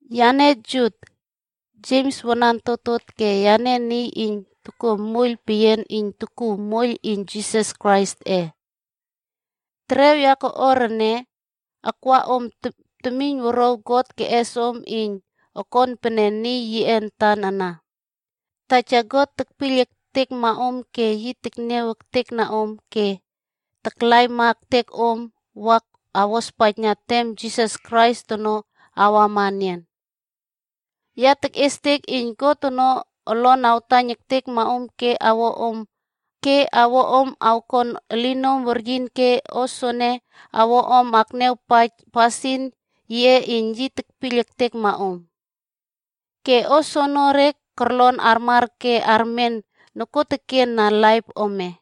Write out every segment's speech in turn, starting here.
Yane Jut, Jems wanan totot ke yane niy iyn tokuo moiyl peyian iyn tokuw moiyl iyn Jisas Kraisꞌe. Terew ya koꞌuar ene, akwa om temiynwuruaw God keꞌes om iyn okon pene niy yiꞌe antan ana. Taja God tekpiyl ektekma om ke yi tekniaw ektekna om ke taklaima ektek om wa awospaijna tem Jisas Krais ono awama enian. Ya tekꞌiestek iyn God ono olon awtaiyn ektekma om ke awo om awkon elinom weryin ke o soene awo om akniawpaij pasin yiꞌe iyn yi tekpiyl ektekma om. Ke o soenere kolon armar ke armen nokuoteken na laip ome.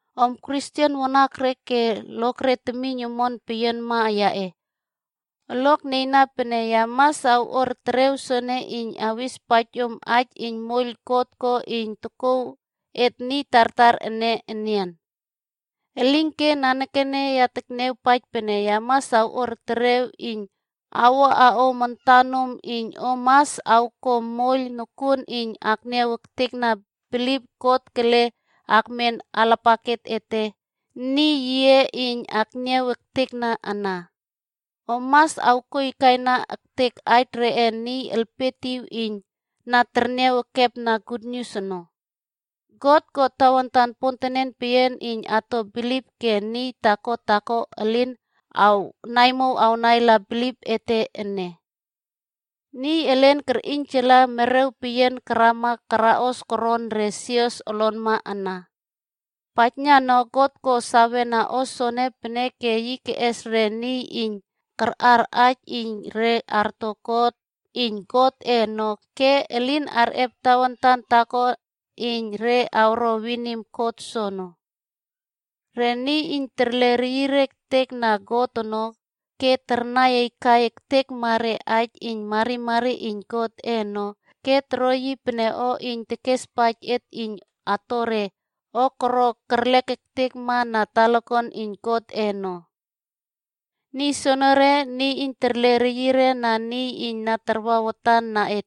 Om Kristen wanakre ke lokre temiyn omon peyianma yaꞌe, olok nieyna pene ya mas awꞌuar terew soene iyn awespaij om aij iyn moiyl God ko iyn tokouw et niy tartar ene enian. Elinke nanekene ya niawpaij pene ya mas awꞌuar terew iyn awuꞌa om etenom iyn om mas awko moiyl nokuon iyn akniaw ektekna bilip God kele akmen alapaket ete niy yiꞌe iyn akniaw ektekna ana. Om mas awkoaikaina ektek aij reꞌe niy elpietiw iyn na terniaw ekepna gutnius ono. God ko tawantan pontenen peyian iyn ato bilip ke niy taako taako elin awnaimow awnaila bilip ete ene. Niy elen kerꞌiynjala merew peyian karama karaꞌos koron re sios olonma ana. Paijna no God ko sawena o soene peneke yi keꞌes re niy iyn kaꞌar aij iyn re arto kot iyn Godꞌe ono ke elin arꞌep tawantan taako iyn re awro winim kot soono. Rene niy iyn terle reyire ektek na God ono ke tarnai aikai ektekma re aij iyn marimari iyn Godꞌe ono ke toro yi pene o iyn tekespaij et iyn ato re o koro kerlek ektekma na talakuan iyn Godꞌe ono. Niy soenere, niy iyn terle reyire na niy iyn na takwa watan na et,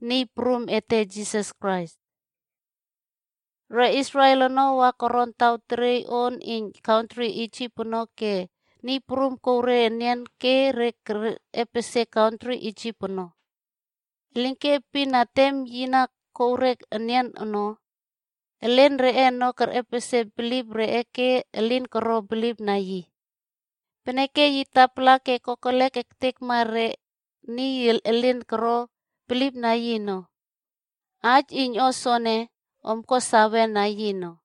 Niy Prum ete Jisas Krais. Re Israel ono, wa koron taw teriey on iyn kantri Isip ono ke Niy Prum kouw re enian ke re kerꞌepesie kantri Isip ono. Elinke epin na tem yi na kouw re enian ono, elen reꞌe ono kerꞌepesie bilip reꞌe ke elin koro bilipna yi. Peneke yi tapala ke kokelek ektekma re niy elin koro bilipna yi ono.a Aij iyn o soene, om ko sawena yi ono.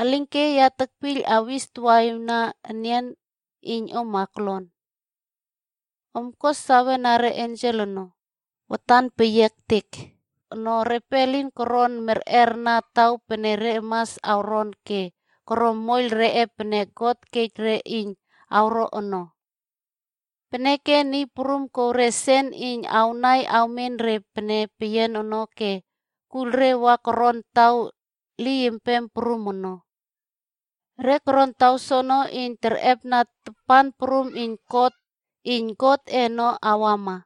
Elinke ya tekpiyl awis tawaꞌiwna enian iyn om aklon. Om ko sawena re ensel ono, watan peyia ektek ono repe elin koron merꞌerna taw pene re mas awronb ke koro moiyl reꞌe pene God kej re iyn awro ono. Peneke Niy Prum kow re sen iyn awnai awmen re pene peyian ono ke kuiyl re wa koron taw liypem prum ono. Re koron taw soono, iyn terꞌepna tapan prum iyn kot iyn Godꞌe ono awama.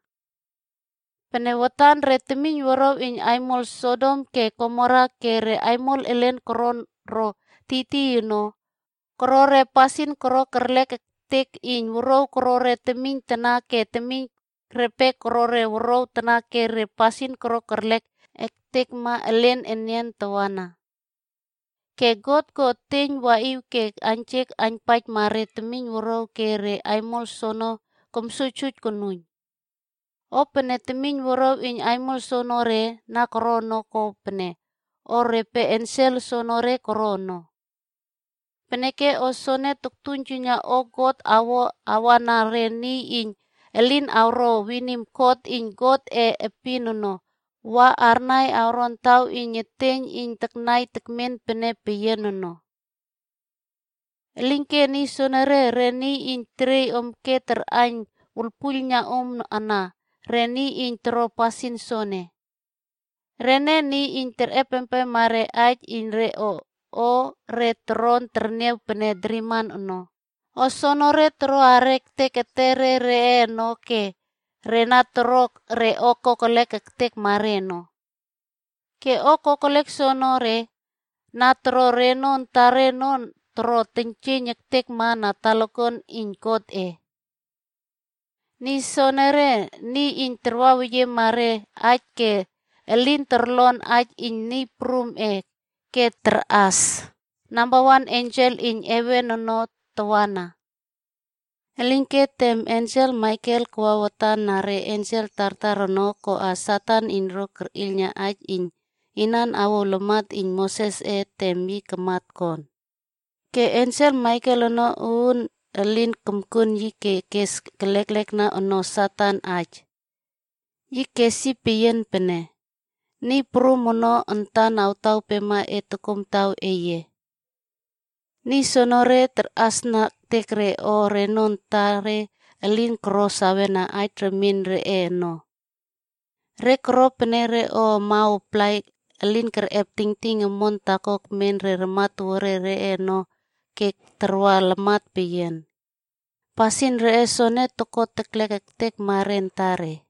Pene watan re temiynwuruaw iyn aimol Sodom ke Gomora ke re aimol elen koron ro tiytiy ono, koro re pasin koro kerlek ektek iyn wuruaw koro temiyn tana ke temiyn repe koro wuruaw tana ke re pasin koro kerlek ektekma elen enian tawana. Ke God ko eteiyn waꞌiw ke aiynjek aiynpaijma re temiynwuruaw ke re aimol soono komsuijsuij konuiyn. O pene temiynwuruaw iyn aimol soonore na koro ono ko pene o repe ensel soenere koro ono. Peneke o soene toktuiynjuiyna o God awo awana re niy iyn elin awro winim kot iyn Godꞌe epin ono wa arnai awron taw iyn eteiyn iyn taknai tekmen pene peyian ono. Elinke niy soenere, re niy iyn teryiy om ke tarꞌaiyn wuiylpuiylna om ana, re niy iyn toro pasin soene. Rene niy iyn terꞌepempem re aij iyn re o re toron terniaw pene driman ono, o soenere toroꞌa ektek etere reꞌe ono ke re na toro re o kokelek ektekma re ono. Ke o kokelek soenere, na toro reno antare ono toro teiynjieiyn ektekma na talakuan iyn Godꞌe. Niy soenere, niy iyn tartaweyiema re aij ke elin torlon aij iyn Niy Prumꞌe ke tarꞌas re nambawan ensel iyn heven ono tawana. Elinke tem ensel Maikel kawa watan na re ensel tartar ono koꞌo Satan iyn ro kerꞌiylna aij iyn inan awouw lamat iyn Mosesꞌe tem yi kamat kon. Ke ensel Maikel ono uun elin komkuon yi ke kes leklekna ono Satan aij. Yi kes yi peyian pene, “Niy Prum ono antan awtawpema e tokomtaw eye.” Niy soenere, tarꞌasna ektek re o reno antare elin koro sawena aij remien reꞌe ono. Re koro pene re o amaw aplai elin kerꞌep tingting omon taako ekmen re ramatowuare reꞌe ono ke tarwa lamat peyian. Pasin reꞌe soene toko teklek ektekma re antare.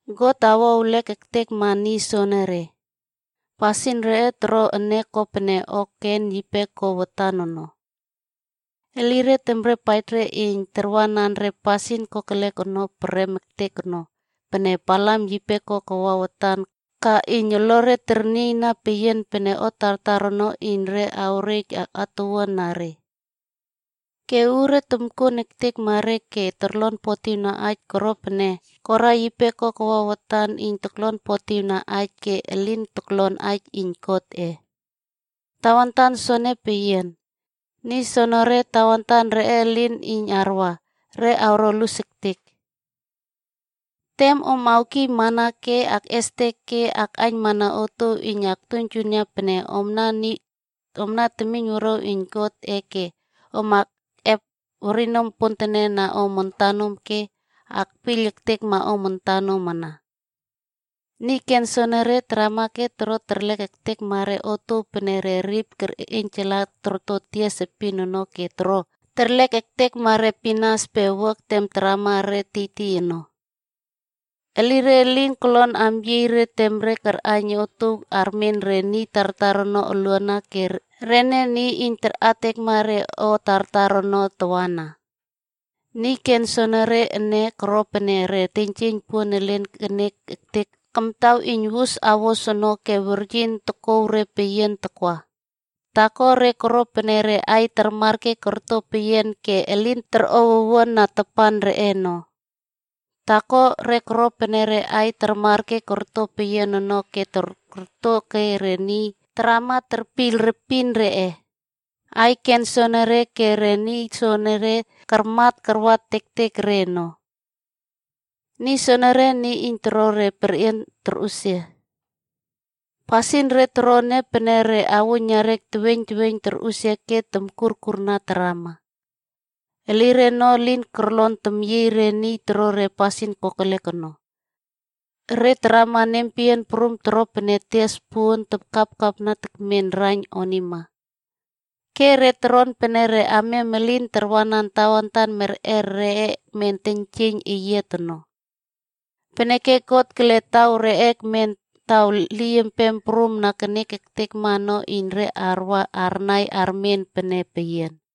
God awo ewlek ektekma niy soenere. Pasin re toro ene ko pene o Kein yipe ko watan ono.c Elire temrepaij re iyn tarwanan re pasin kokelek ono prem ektek ono pene Balamd yipe ko kawa watan ka iyn olore ternieyna peyian pene o tartar ono iyn re awrej atuwuan na re. Ke uure tomkuon ektekma re ke torlonpotiwna aij koro pene Kora yipe koe kawa watan iyn toklonpotiwna aij ke elin toklon aij iyn Godꞌe. Tawantan soene peyian, niy soenere tawantan reꞌe elin iyn arwa, re awro lus ektek. Tem om awkiymana ke akꞌestek ke akꞌaiynmana otuow iyn awtuiynjuiyna pene omna temiynwuruaw iyn Godꞌe ke om akꞌep werinom pontenen na om antanom ke akpiyl ektekma om antanom ana. Niy ken soenere, tarama ke toro terlek ektekma re otuow pene re rip kerꞌiynjala torto tias epin ono ke toro terlek ektekma re pinas pe wuak tem tarama re tiytiy ono.f Elire elin kolon amyiey re tem re arꞌaiyn otuow armen re niy tartar ono oluana ke rene niy iyn tarꞌatekma re o tartar ono tawana. Niy ken soenere ene, koro pene re teiynjieiyn puon elin kenek ektek kamtaw iyn wus awos ono ke weryin tokouw re peyian takwa. Taako, re koro pene re aiy tarmar ke torto peyian ke elin torꞌow owuan na tapan reꞌe ono. Taako enian, re koro pene re aiy karmat ono ke korto ke re niy tarama terpiyl repin reꞌe. Aiy ken soenere ke re niy soenere, karmat karwa tektek re ono. Niy soenere, niy iyn toro re perꞌian torꞌusia. Pasin re toro ene pene re auiynariak teweiyn teweiyn torꞌusia ke tomkurkurna tarama. Elire ono elin kolon temyieiy re iyn toro re pasin kokelek ono. Re tarama nempeyian prum toro pene tias puon takapkapna tekmen raiyn onima. Ke re toron pene re amiam elin tarwanan tawantan merꞌer reꞌe ekmen teiynjieiyn eyiat ono. Peneke God kele taw reꞌe ekmen taw liypem prum na kenek ektekma ono iyn re wa arnai armen pene peyian.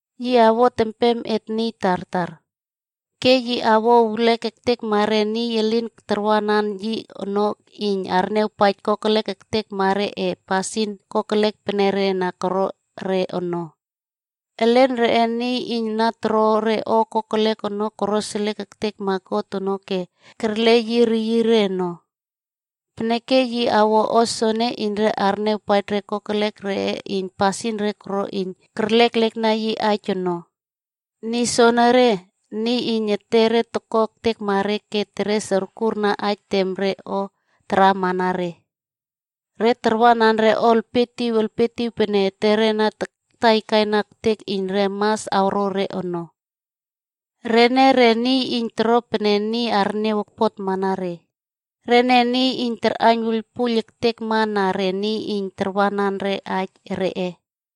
Yi awot empem et niy tartar. Ke yi awo ewlek ektekma re niy elin karwanan yi ono iyn arniawpaij kokelek ektekma reꞌe pasin kokelek pene re na koro re ono. Elen reꞌe niy iyn na toro re o kokelek ono koroseliek ektekma God ono ke kerle yi reyire ono. Peneke yi awo o soene iyn re arniawpaij re kokelek reꞌe iyn pasin re koro iyn keres kerleklekna yi aij onog.” Niy soenere, niy iyn etere toko ektekma re, ke teres okurna aij tem re o taramana re. Re tarwanan re o elpietiw elpietiw pene etere na takaina ektek iyn re mas awro re ono. Rene re niy iyn toro pene niy arniaw okpotmana re. Rene niy iyn tarꞌaiyn wuiylpuiyl ektekma na re niy iyn tarwanan aij reꞌe.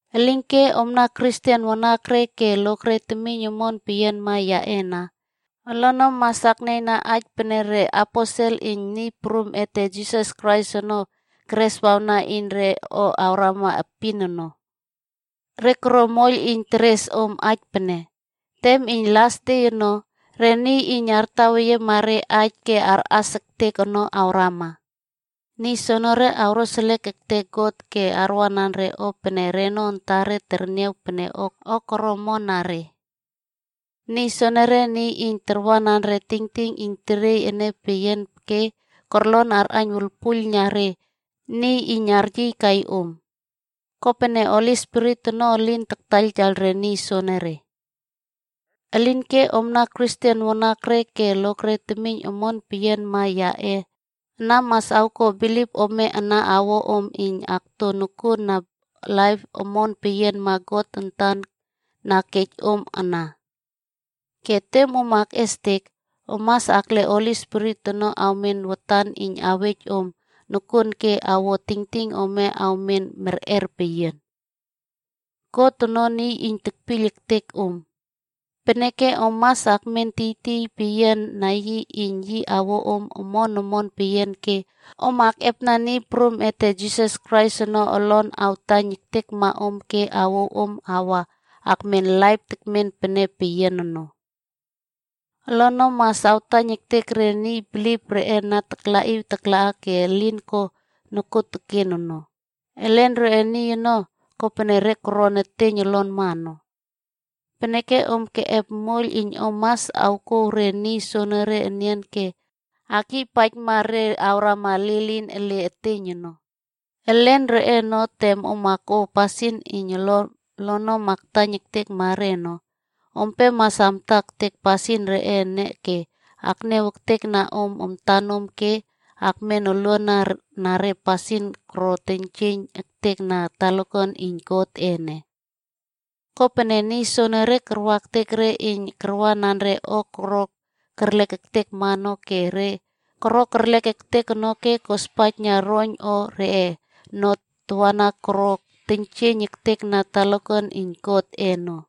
Elinke omna Kristen wanakre ke lokre temiyn omon peyianma yaꞌe ana, olonom mas aknieyna aij pene re aposel iyn Niy Prum ete Jisas Krais ono kereswawna iyn re o awrama epin ono. Re koro moiyl iyn teres om aij pene, “Tem iyn las de ono, re niy iyn artaweyiema re aij ke arꞌas ektek ono awrama. Niy soenere awroseliek ektek God ke arwanan re o pene reno antare terniaw pene o koro omon na re.” Niy soenere, niy iyn tarwanan re tingting iyn teriey ene peyian ke kolon arꞌaiyn wuiylpuiylna re niy iyn aryiykai om. Kopene Holi Spirit ono elin taktaiyltaiyl re niy soenere. Elinke omna Kristen wanakre ke lokre temiyn omon peyianma yaꞌe ana mas awko bilip ome ana awo om iyn akto nokuon na laip omon peyianma God antan na kej om ana. Ke tem om akꞌestek, om mas akle Holi Spirit ono awmen watan iyn awej om nokuon ke awo tingting ome awmen merꞌer peyian. God ono niy iyn tekpiyl ektek om. Peneke om mas akmen tiytiy peyiana yi iyn yi awo om omon omon peyian ke om akꞌepna Niy Prum ete Jisas Krais ono olon awtaiyn ektekma om ke awouw om wa akmen laip tekmen pene peyian ono. Olonom mas awtaiyn ektek re niy bilip reꞌe na taklaꞌiw taklaꞌa ke elin ko nokuoteken ono. Elen reꞌe niy ono, kopene re koron eteiyn olonma no. Peneke om keꞌep moiyl iyn om mas awkouw re niy soene enian ke akyiypaijma re awrama lilin ele eteiyn ono. Elen reꞌe ono, tem om awko pasin iyn olonom awtaiyn ektekma re ono, ompe mas amta ektek pasin reꞌe ene ke akniaw ektekna om antanom ke akmen olwuan na re pasin koro teiynjieiyn ektek na talakuan iyn Godꞌe ene. Kopene, niy soenere karwa ektek re iyn karwanan re o koro kerlek ektekma ono ke re koro kerlek ektek ono ke kospaijna roiyn o reꞌe ono tawana koro teiynjieiyn ektekna talakuan iyn Godꞌe ono.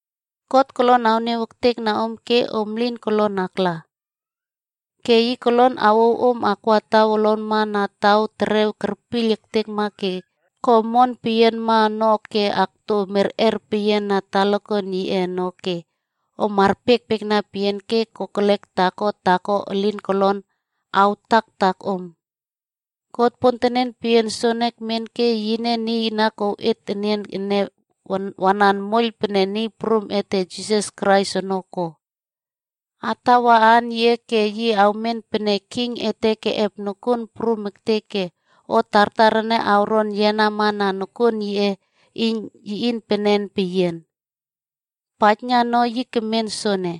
God kolon awniaw ektekna om ke om lin kolon akla. Ke yi kolon awouw om akwa olonma na taw terew kerpiyl ektekma ke ko omon peyianma ono ke akto merꞌer peyian na talakuan yiꞌe ono ke om arpiekpiekna peyian ke kokelek taako taako elin kolon awtaktak om. God pontenen peyian soene ekmen ke yine niy na kouw et enian ene wanan moiyl pene Niy Prum ete Jisas Krais ono ko. Atawa aan yiꞌe ke yi awmen pene king ete keꞌep nokuon prum ektek ke o tartar ene awron yenama na nokuon yiꞌe iynpenen peyian. Paijna no yi kemen sopene,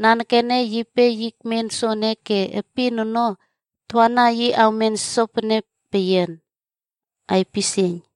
nanekene yipe yi ekmen sopene ke epin ono tawana, yi awmen sopene peyian. Aipisieiyn.